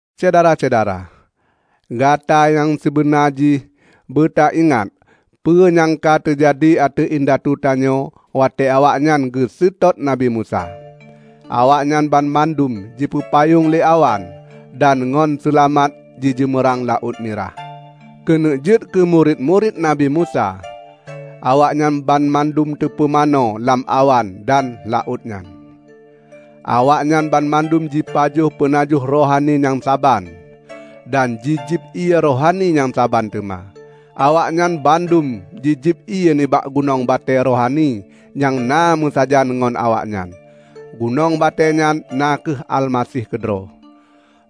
Syedara-syedara! Gata nyang sibeuna jih beuta ingat peue nyang ka teujadi ateueh indatu tanyoe watée awaknyan geuseutôt Nabi Musa. Awaknyan banmandum jipeupayong lé awan, dan ngon seulamat jijeumeurang Laôt Mirah. Keuneuk jeuet keu murit-murit Nabi Musa, awaknyan banmandum teupeumanö lam awan dan laôt nyan. Awaknyan banmandum jipajoh peunajoh rohani nyang saban, dan jijieb ié rohani nyang saban teuma. Awaknyan bandum jijieb ié nibak gunong batée rohani nyang na meusajan ngon awaknyan; gunong batée nyan na kheueh Almaseh keudroe.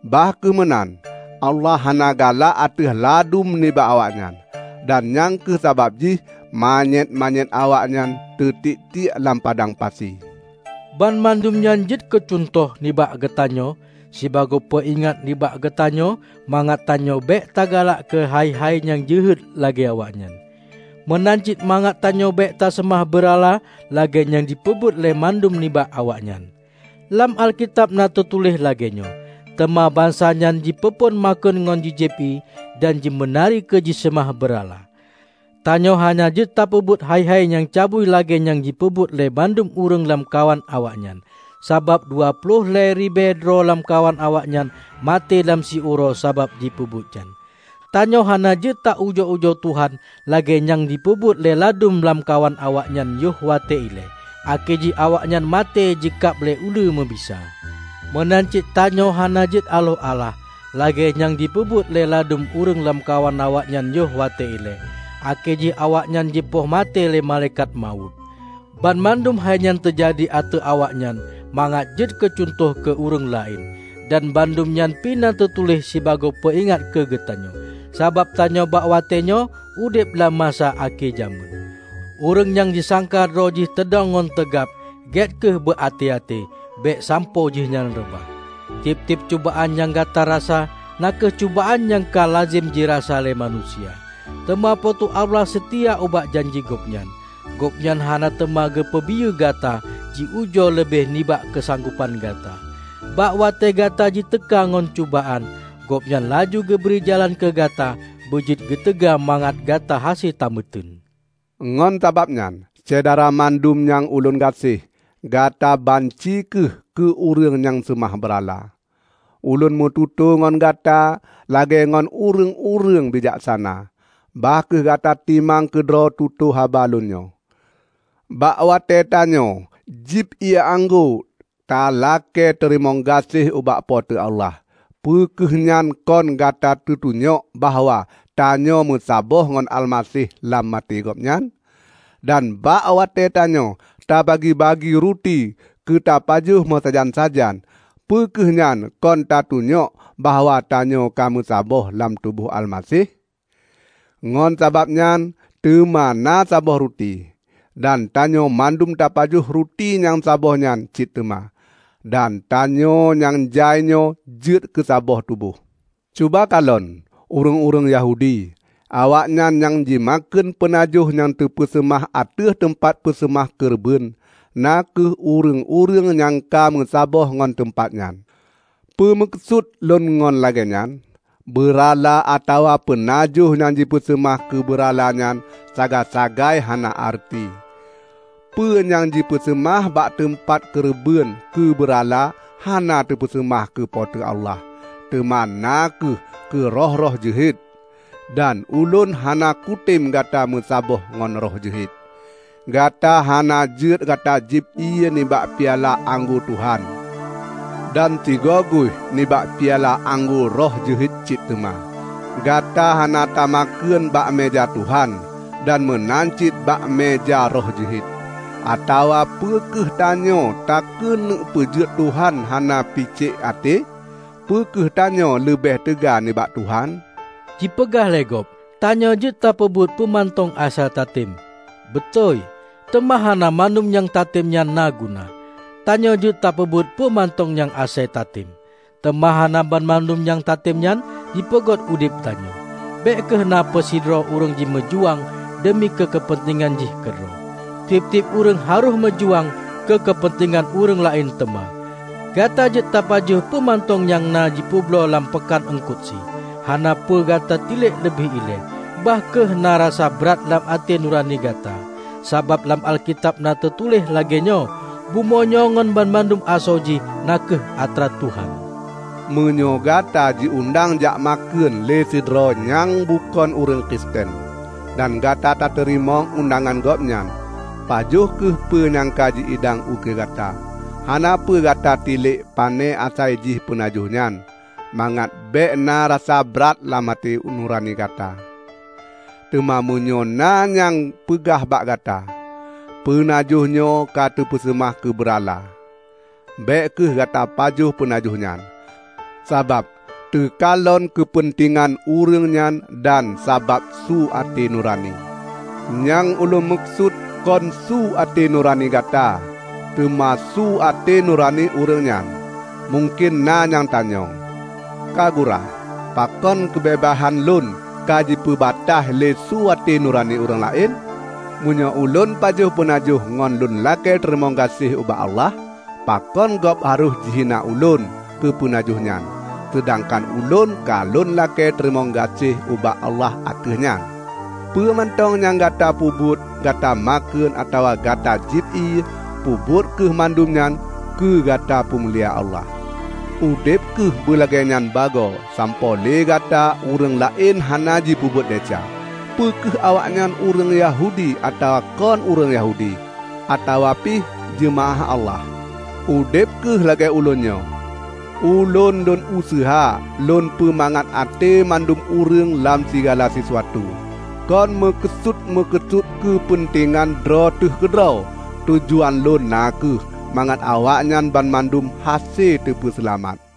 Bah kheueh meunan, Allah hana galak ateueh ladum nibak awaknyan, dan nyang kheueh sabab jih manyét-manyét awaknyan teutiek-tiek lam padang pasi. Banmandum nyan jeuet keucuntoh nibak geutanyoe, sibagoe peuingat nibak geutanyoe mangat tanyoe bék ta galak keuhai-hai nyang jeuhet lagée awaknyan. Meunan cit mangat tanyoe bék taseumah beurala lagée nyang jipeubuet lé ladum nibak awaknyan. Lam Alkitab na teutuléh lagée nyoe, "Teuma bansa nyan jipeuphon makheun ngon jijieb ié, dan jimeunari keu jiseumah beurala." Tanyoe hana jeuet tapeubuet hai-hai nyang cabui lagée nyang jipeubuet lé ladum ureuëng lamkawan awaknyan. Sabab, dua ploh lhée ribée droe lamkawan awaknyan maté lam siuroe sabab jipeubuet nyan. Tanyoe hana jeuet ta ujoe-ujoe Tuhan lagée nyang jipeubuet lé ladum lamkawan awaknyan yoh watée ilée, akhé jih awaknyan maté jikab lé uleue meubisa. Meunan cit tanyoe hana jeuet aloh alah; lagée nyang jipeubuet lé ladum ureuëng lamkawan awaknyan yoh watée ilée, akhé jih awaknyan jipoh maté lé Malaikat Mawöt Banmandum hainyan teujadi ateueh awaknyan mangat jeuet keucuntoh keu ureuëng laén. Dan bandum nyan pi na teutuléh sibagoe peuingat keu geutanyoe. Sabab tanyoe bak watée nyoe udeb lam masa akhé jamén. Ureuëng nyang jisangka droe jih teudong ngon teugab, gét kheueh beu até-até; bék sampoe jihnyan reubah. Tieb-tieb cubaan nyang Gata rasa na kheueh cubaan nyang ka lazem jirasa lé manusia. Teuma Po teu Allah seutia ubak janji Gobnyan. Gobnyan hana teuma geupeubiyeu Gata jiujoe leubeh nibak keusanggopan gata. Bak watée Gata jiteuka ngon cubaan, Gobnyan laju geubri jalan keugata beujeuet keuteuga mangat Gata hase tameuteun. Ngon sabab nyan, Syedara mandum nyang ulôn gaséh, gata banci kheueh keu ureuëng nyang seumah beurala. Ulôn meututoe ngon gata lagée ngon ureuëng-ureuëng bijaksana. Bah kheueh gata timang keudroe tutoe haba lôn nyoe. Bak watée tanyoe jieb ié anggô talakée teurimong gaséh ubak Po teu Allah, peu kheueh nyan kon ka teutunyok bahwa tanyoe meusaboh ngon Almaseh lam maté Gobnyan? Dan bak watée tanyoe tabagi-tabagi ruti keutapajoh meusajan-sajan, peu kheueh nyan kon ka teutunyok bahwa tanyoe ka meusaboh lam tuboh Almaseh? Ngon sabab nyan teuma na saboh ruti, dan tanyoe mandum tapajoh ruti nyang saboh nyan cit teuma, dan tanyoe nyang jai nyoe jeuet keusaboh tuboh. Cuba kalon ureuëng-ureuëng Yahudi. Awaknyan nyang jimakheun peunajoh nyang teupeuseumah ateueh teumpat peuseumah keureubeuen, na kheueh ureuëng-ureuëng nyang ka meusaboh ngon teumpat nyan. Peue meukeusut lôn ngon lagée nyan? Beurala atawa peunajoh nyang jipeuseumah keubeurala nyan sagai-sagai hana areuti. Peue nyang jipeuseumah bak teumpat keureubeuen keu beurala hana teupeuseumah keu Po teu Allah, teuma na kheueh keu roh-roh jeuhet. Dan ulôn hana kutem gata meusaboh ngon roh jeuhet. Gata hana jeuet gata jieb ié nibak piala anggô Tuhan, dan sigoguih nibak piala anggô roh jeuet cit teuma. Gata hana tamakheun bak meuja Tuhan, dan meunan cit bak meuja roh jeuhet. Atawa peu kheueh tanyoe takeuneuk peujeuet Tuhan hana picék até? Peu kheueh tanyoe leubeh teuga nibak Tuhan? Jipeugah lé gob, "Tanyoe jeuet tapeubuet peue mantong asai tatem." Beutôi! Teuma hana mandum nyang tatem nyan na guna. "Tanyoe jeuet teupeubuet peue mantong nyang asai tatem" -- teuma hana banmandum nyang tatem nyan jipeugot udeb tanyoe. Bék kheueh na peusidroe ureuëng jimeujuang deumi keu keupeuntengan jih keudroe. Tieb-tieb ureuëng harôh meujuang keu keupeuntengan ureuëng laén teuma. Gata jeuet tapajoh peue mantong nyang na jipeubloe lam peukan eungkot sie. Hana peue gata tilek leubeh ilée, bah kheueh na rasa brat lam até nurani gata. Sabab lam Alkitab na teutuléh lagée nyoe, "Bumoe nyoe ngon banmandum asoe jih na kheueh atra Tuhan." Meunyoe gata jiundang jak makheun lé sidroe nyang bukon ureuëng Kristen, dan gata tateurimong undangan gobnyan, pajoh kheueh peue nyang ka ji idang ukeue gata. Hana peue gata tilek pane asaijih peunajoh nyan, mangat bék na rasa brat lam até nurani gata. Teuma meunyoe na nyang peugah bak gata, "Peunajoh nyoe ka teupeuseumah keubeurala," bék kheueh gata pajoh peunajoh nyan, sabab teukalon keupeuntengan ureuëng nyan dan sabab su até nurani. Nyang ulôn meukeusut kon su at`e nurani gata, teuma su at`e nurani ureuëng nyan. Mungken na nyang tanyong, "Ka gura, pakon keubeubaihan lôn ka jipeubataih lé su até nurani ureuëng laén? Meunyoe ulôn pajoh peunajoh ngon lôn lakée teurimong gaséh ubak Allah, pakon gob harôh jihina ulôn keu peunajohnyan, seudangkan ulôn ka lôn lakée teurimong gaséh ubak Allah ateueh nyan?" Peue mantong nyang Gata peubuet -- Gata makheun atawa Gata jieb ié -- peubuet kheueh mandum nyan keu gata peumulia Allah. Udeb kheueh beulagée nyan bagoe sampoe lé Gata ureuëng laén hana jipeubuet desya; peu kheueh awaknyan ureuëng Yahudi atawa kon ureuëng Yahudi, atawa pih jeumaáh Allah. Udeb kheueh lagée ulôn nyoe. Ulôn lôn useuha lôn peumangat até mandum ureuëng lam sigala sisuatu, kon meukeusut-meukeusut keupeuntengan droe teuh keudroe. Tujuan lôn na kheueh mangat awaknyan banmandum hase teupeuseulamat.